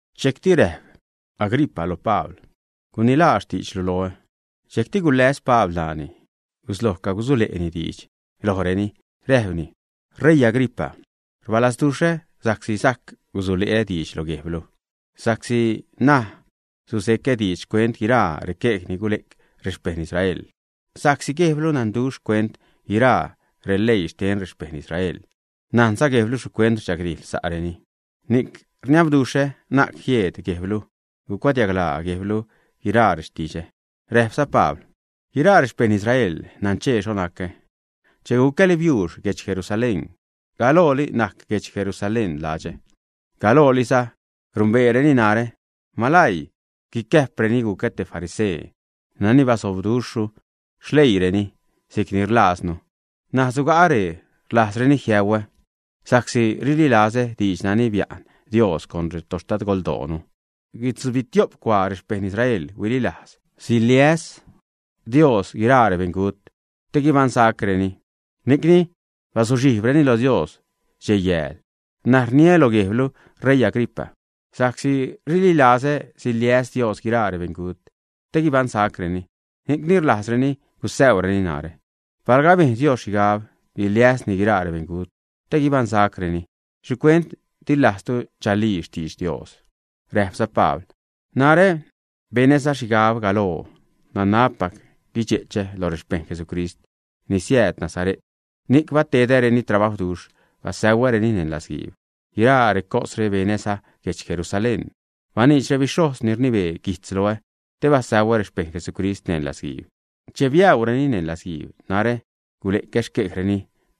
Dxejcti räjp Agripa lo Pabl: ―Gunilaa xtiidxlu loonu. Dxejcti guläs Pabl ṉaani, gusloj cagusule'ni diidx lojreni. Räjpni: ―Reii Agripa, rbalazduxhä sa'csi sajc gusule'ä diidx lo guejblu, sa'csi ṉaj suze'cä diidx xcuent guiraa requej ni gule'c rexpejṉ Israel. Sa'csi guejblu nanduxh xcuent guiraa releii xten rexpejṉ Israel. Najnza guejblu xhicuent rdxagdijḻ sa'reni. Ni'c rniabduxhä na'c jieed guejblu gucuadiaglaa guejblu guiraa rextidxä. Räjpza Pabl: ―Guiraa rexpejṉ Israel naṉchee xho nacä che gucäli biuux guedx Jerusalén. Galooli najc guedx Jerusalén ladxä. Galooliza numbeereni narä, malaii guicäjpreni gucä te farisee nani bazobduxhru xleiinu si'cni rililajznu. N̲aj suga'a ree, rlajzreni jiäuä sa'csi rililazä diidx nani bia'n Dios con retoxtadgoldoonu. Guitzubitiop cuaa rexpejṉ Israel huililajz siliäs Dios guiraa rebeṉgut te guibaṉsacreni. Ni'cni bazuxhijbreni lo Dios dxej-yääl. N̲aj rniliä lo guejblu ṟeii Agripa, sa'csi rililazä siliäs Dios guiraa rebeṉgut te guibaṉsacreni, ni'cni rlajzreni gusäureni narä. Palga abejn Dios xhigab guiliäsni guiraa rebeṉgut te guibaṉsacreni, ¿xhicuent di lajztu chalii xtidx Dios? Räjpza Pabl: ―Narä benäza xhigab galoo nanabpac guidxe'chä loj rexpejṉ Jesucrist ni siääd Nazare't, ni'c batedäreni trabajwduxh basäuäreni neṉ latzguiib. Guiraa recosre benäza guedx Jerusalén. Baniidx rebixhojz ni rnibee guijtz loä te basäuä rexpejṉ Jesucrist neṉ latzguiib. Che biäureni neṉ latzguiib, narä gule'cä xquejreni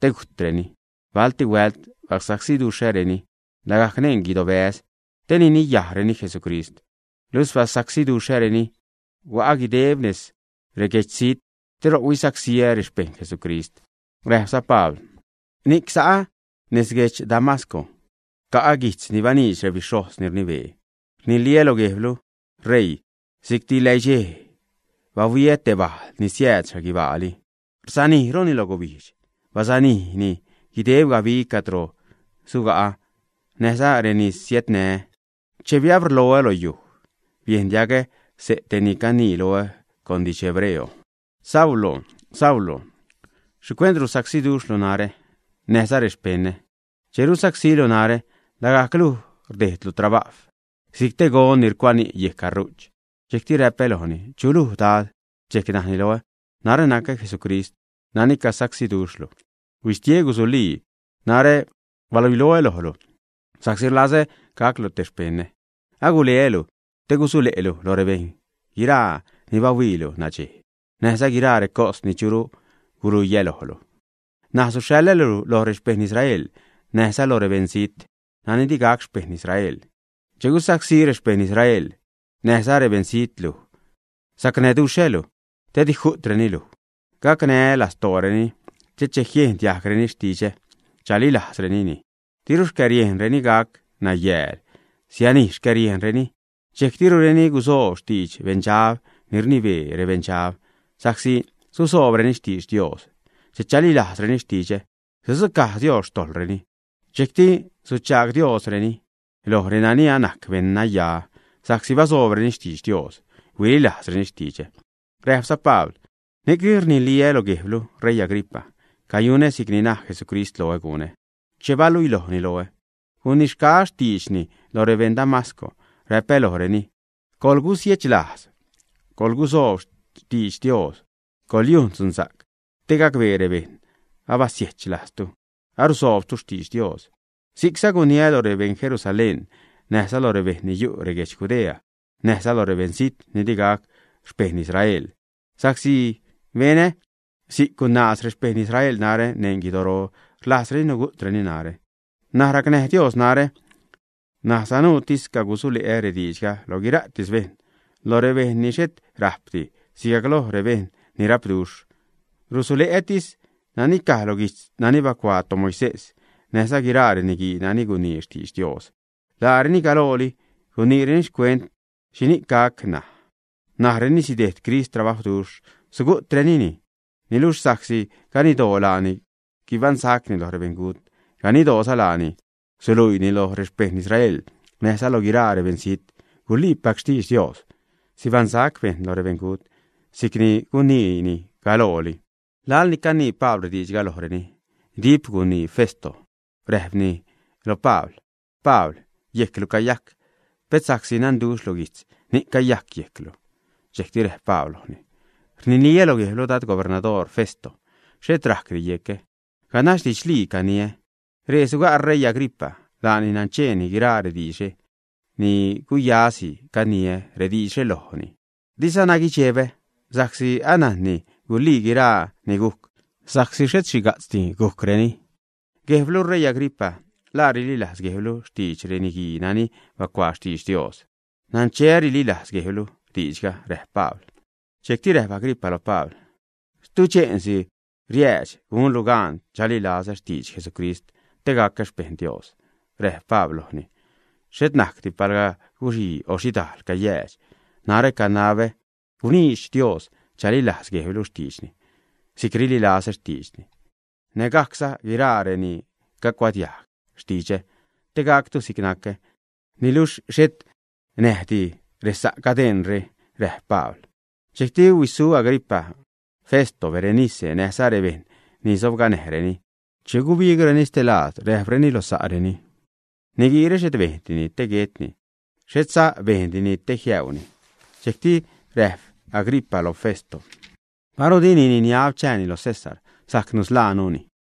te gujtreni. Balti huält basacsiduxhäreni lagajc neṉ reguidobäz te niniyajreni Jesucrist. Luxh basacsiduxhäreni, hua'a guideb nez reguedxzijt te ro'c huisacsíä rexpejṉ Jesucrist. Räjpza Pabl: ―Ni'c sa'a nez guedx Damasco, ca'a guijtz ni baniidx rebixhojz ni rnibee. Rniliä lo guejblu, ṟeii, si'cti läidxej, bahuiä te bajl ni siääd xhaguibaali. Rsanijruni loj gubijdx. Basanijni guideb gabi cadro suga'a näjza reni sanää. Che biabrloonu lo yuj, biejn diagä xse' te ni canii loä con didx hebreo: “Saulo, Saulo, ¿xhicuent rusacsílu narä näjza rexpeṉä? Che rusacsílu narä, lagajc luj rdejdlu trabajw, si'c te gon ni rucuani' yejc gaṟu'ch.” Dxejcti räpä lojni: “¿Chu luj Dad?” Dxejc najni loä: “Narä nacä Jesucrist nani cagusacsíduxhlu. Huistie, gusulii. Narä baluiloä lojlu sa'csi rlazä gaclu te xpeṉä. Aguleälu te gusule'lu lo rebejṉ guiraa ni bahuiilu nadxej, näjza guiraa recos ni churu guluiä lojlu. N̲aj suxhaḻälu loj rexpejṉ Israel näjza lo rebeṉzijt nani di gac xpejṉ Israel. Che gusacsí rexpejṉ Israel näjza rebeṉzijt luj, sacnäduxhälu, te di ju'treni luj. Gacnää́ lastooreni te che jiejn diajgreni xtidxä, chalilajzrenini, diru xcäriejnreni gac nayääl, sianij xcäriejnreni. Dxejc dirureni gusoob xtidx Beṉdxab ni rnibee rebeṉdxab, sa'csi susoobreni xtidx Dios. Che chalilajzreni rextidxä, sudzucaj Dios xtojḻreni. Dxejcti suchaag Diosreni loj renani anajc beṉnaya sa'csi basoobreni xtidx Dios, huililajzreni xtidxä.” Räjpza Pabl: ―Ni'cni rniliä lo guejblu, ṟeii Agripa, cayunä si'cni naj Jesucrist loä gunä che baluilojni loä. Gunixgaä xtiidxni lo rebeṉ Damasco. Räpä lojreni: “Coḻgusiechlajz, coḻgusoob xtidx Dios. Coḻyujn dzunsa'c te gacbee rebejṉ abasiechlajztu, arusoobtu xtidx Dios.” Si'cza guniä lo rebeṉ Jerusalén, näjza lo rebejṉ ni yu' reguedx Judea, näjza lo rebeṉzijt ni di gac xpejṉ Israel. Sa'csi benä si'c, gunaaz rexpejṉ Israel narä neṉ guidoro, rlajzreni nugu'treni narä. N̲aj racnäj Dios narä, ṉaj sanuutis cagusule'ä rediidxga lo guiraatis bejṉ. Loj rebejṉ ni xhet rajpdi sigajc loj rebejṉ ni rapduxh. Rusule'ätis nani caj lo guijtz nani bacuaa toMoisés näjza guiraa reniguii nani gunii xtidx Dios. Laareni galooli guniireni xcuent xhini'c gac ṉaj. Najreni sidejd Crist trabajwduxh, sugu'trenini. Niluxh sa'csi ganiddoo laani guibaṉsacni lo rebeṉgut, ganiddooza laani suluiini loj rexpejṉ Israel näjza loj guiraa rebeṉzijt guliipac xtidx Dios, sibaṉsac bejṉ lo rebeṉgut, si'c ni guniini galooli. Laḻ ni canii Pabl rediidxga lojreni, dip gunii Festo, räjpni lo Pabl: ―Pabl, yejclu cayajc. Pet sa'csi nanduxhlu guijtz ni'c cayajc yejclu. Dxejcti räjp Pabl lojni: ―Rniliä lo guejblu dad gubernador Festo, xhet rajcdi yecä. Ganax didxlii caniä. Ree suga' ṟeii Agripa. Laani nancheeni guiraa rediidxre, ni'c guyasi caniä rediidxre lojni, dizana guidxebä sa'csi anajnni gulii guiraa ni gujc, sa'csi xhet xhiga'tzdi gujcreni. Guejblu ṟeii Agripa, ¿la rililajz guejblu xtidx reniguii nani bacuaa xtidx Dios, ä? Naṉcheä rililajz guejblu diidxga ―räjp Pabl. Dxejcti räjp Agripa lo Pabl: ―Tuche'nsi riäädx gunlu gan chalilazä xtidx Jesucrist te gacä xpeṉ Dios. Räjp Pabl lojni: ―Xhet najcdi palga guxii o xhidajl cayäädx, narä canabä guniidx Dios chalilajz guejblu xtiidxni si'c rililazä xtiidxni, nägajcza guiraa reni cacuadiajg xtidxä te gactu si'c nacä, niluxh xhet näjdi resa' cadeṉre ―räjp Pabl. Dxejcti huisu Agripa, Festo, Berenice, näjza rebejṉ ni sobganäjreni. Che gubigreni stelaad, räjpreni lo sa'reni: ―Niguiire xhet bejndini te guetni, xhetza bejndini te jiäuni. Dxejcti räjp Agripa lo Festo: ―Paru dini niniab chääni lo César, sajc nusḻaanuni.